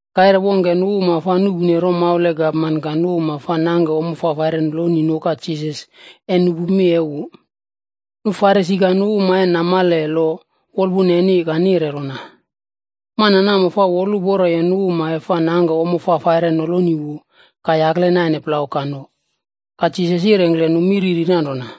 Kaire wongke nu uma fa nuꞌpune romaula e gapman ka nu uma fa nangke ommo fafaire noloni nuka Jisas e nupu mi e wu. Nu Farisi ka nu uma e namale lo wolpuna neni ka nire rona, “Mana namo fa woluporo e nu uma e fa nangke ommo fafaire noloni wu ka yakle naine plau ka none.” Ka Jisas yirengkle nu mi riri nanrona: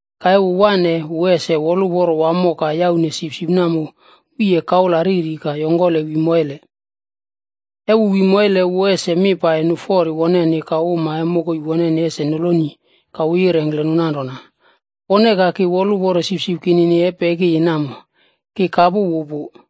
Ka e wu waꞌne, wu ese woluporo wamo ka yaune sipsip namo wiye kaula riri ka yongkole wi moile. E wu wi moile, wu ese mi pai nu fori woneni ka uma e mokoi woneni ese noloni ka wu yirengkle nu nanrona, ‘Pone ka ki woluporo sipsip kinini e pekiyi namo, ki kapu wu pu.’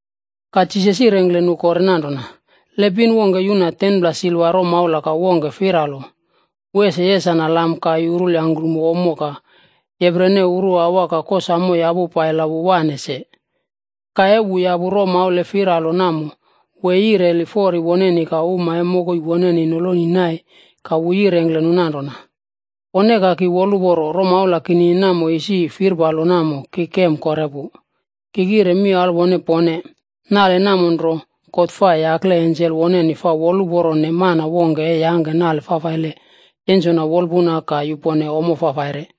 Ka Jisas yirengkle nu kore nanrona, “Le pin wongke yuna 10pla silva romaula ka wongke firalo. Wu ese yesana lam ka yurul yangkrumo ommo ka yeprene uruawa ka kosamo yapu pai la wu wane se. Ka e wu yapu romaula e firalo namo, wu e yireli fori woneni ka uma e mokoi woneni noloni nai ka wu yirengkle nu nanrona, ‘Pone ka ki woluporo, romaula kinini namo isi firpalo namo ki kem kore pu.’ Ki kire mi alwone pone, nale namo nro, God fa yakle ensel woneni fa woluporone mana wongke e yangke nale fafaile yensona wolpuna ka yupone ommo fafaire.”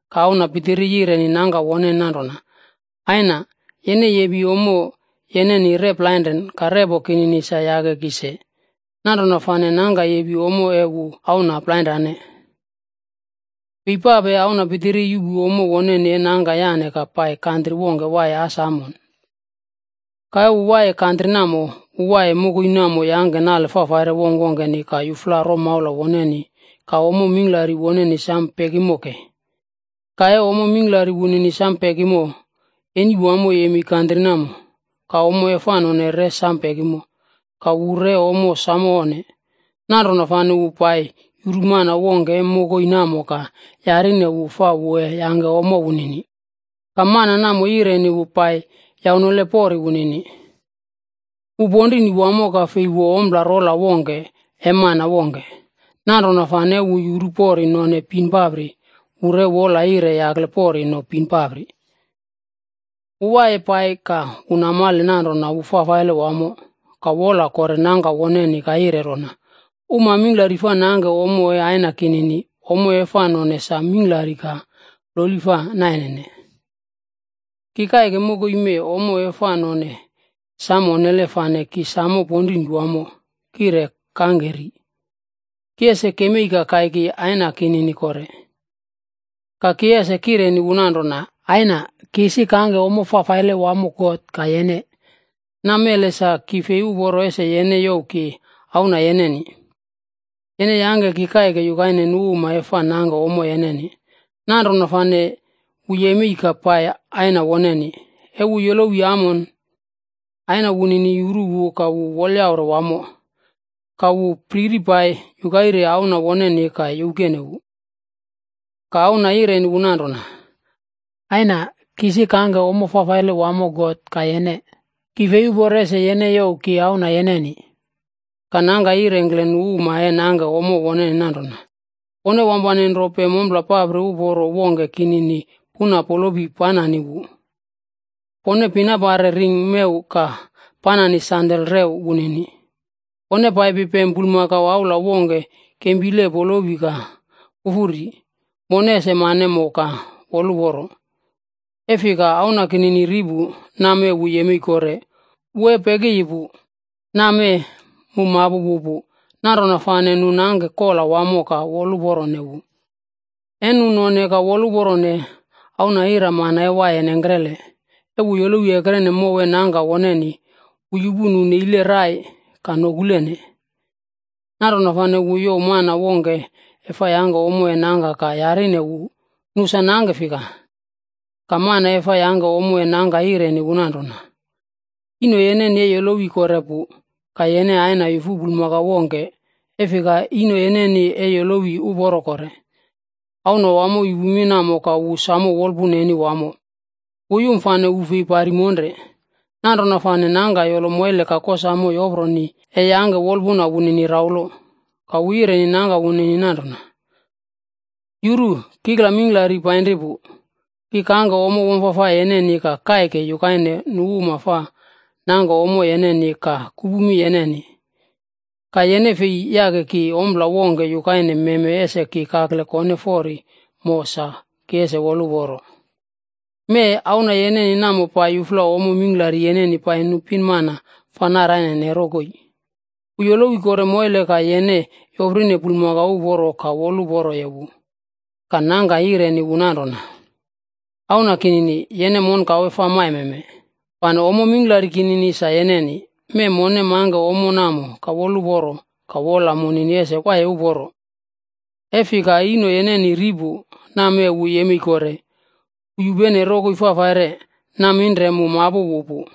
Ka auna pitiri yireni nangka woneni nanrona, ‘Aina, yene yepi ommo yeneni rep plainren ka repo kinini sa yake ki se.’ Nanrona fane nangka yepi ommo e wu auna plainrane. “Fei pape auna pitiri yuꞌpu ommo woneni e nangka yane ka pai kantri wongke waiye as amon. Ka wu waiye kantri namo. Wu waiye mokoi namo yangke nale fafaire wongkwongkeni ka yufla romaula woneni ka ommo mingklari woneni sam pekimo kei. Ka e ommo mingklari wunini sam pekimo, eni wamo yemei kantri namo, ka ommo e fa none re sam pekimo. Ka wu re ommo samo onne. Nanrona fane wu pai yuru mana wongke e mokoi namo ka yarine wu fa wu e yangke ommo wunini. Ka mana namo yireni wu pai yaunole pori wunini. Wu ponrini wamo, ka fei wo ompla rola wongke e mana wongke. Nanrona fane e wu yuru pori none bin papri, wu re wola yire yakle pori no bin papri. “Wu waiye pai ka wu namale nanrona wu fafaile wamo, ka wola kore nangka woneni ka yire rona, ‘Uma mingklari fa nangke ommo e aina kinini, ommo e fa none sa mingklari ka ploli fa nainene. Ki kaike mokoi mee, ommo e fa none samo onnele fane ki samo ponrini wamo kire kangke ri. Ki ese kemei ka kaiki aina kinini kore, ka ki ese kireni wu nanrona, “Aina, ki isi kangke nale fafaile wamo God ka yene. Namele sa ki fei uporo ese yene youw ki auna yeneni. Yene yangke ki kaike yukaine nu uma e fa nangke ommo yene.” ’ Nanrona fane wu yemei ka pai aina woneni. “E wu yolowiye amon, aina wunini yuru wu ka wu wolyaure wamo. Ka wu priri pai yukaire auna woneni ka youkene wu. “Ka auna yireni wu nanrona, ‘Aina, ki isi kangke ommo fafaile wamo God ka yene. Ki fei uporo ese yene youw ki auna yeneni.’ “Ka nangka yirengkle nu uma e nangke ommo woneni nanrona, ‘Pone wampane nro pem ompla papri uporo wongke kinini puna polopi panani wu. Pone pinapare ring mew ka panani sandal rew wunini. Pone paipi pem bulmakau aula wongke kempile polopi ka pufu ri. Mone ese mane mo ka woluporo. E fika auna kinini ri pu. Nammee wu yemei kore, wu e pekiyi pu, nammee mu mapu wu pu.’ Nanrona fane nu nangke kola wamo ka woluporone wu. “E nu none ka woluporone, auna iramana e waiye nengkrele. E wu yolowi ekrene mow e nangka woneni, wu yupu nu neilene rai ka nokulene. Nanrona fane wu youw mana wongke e fa yangke ommo e nangka ka yarine wu nu sa nangke fika. Ka mana e fa yangke ommo e nangka yireni wu nanrona, ‘Ino yeneni e yolowi kore pu, ka yene aina yufu bulmakau wongke, e fika ino yeneni e yolowi uporo kore.’ “Auna wamo yupu mi namo ka wu samo wolpuna neni wamo, wu yum fane wu fei pari monre. Nanrona fane nangka yolo moile ka kosamo yoproni, e yangke wolpuna wunini raulo. Ka wu yireni nangka woneni nanrona, ‘Yuru! Kikla mingklari painri pu, ki kangke ommo wamfafai yeneni ka kaike yukaine nu uma fa nangke ommo yeneni ka kupu mi yeneni. Ka yene fei yake ki ompla wongke yukaine meme ese ki kakle kone fori mo sa ki ese woluporo. Mee, auna yeneni namo pai yufla ommo mingklari yeneni pai nu pinmana fa narainene rokoi, wu yolowi kore moile, ka yene yoprine bulmakau uporo ka woluporoye wu.’ “Ka nangka yireni wu nanrona, ‘Auna kinini, yene monkawe fa maimeme, fane ommo mingklari kinini, sa yeneni. Mee, mone mangke ommo namo ka woluporo ka wola munini ese waiye uporo, e fika ino yeneni ri pu, nammee wu yemei kore. Wu yupene rokoi fafaire, naminre mu mapu wu pu.’”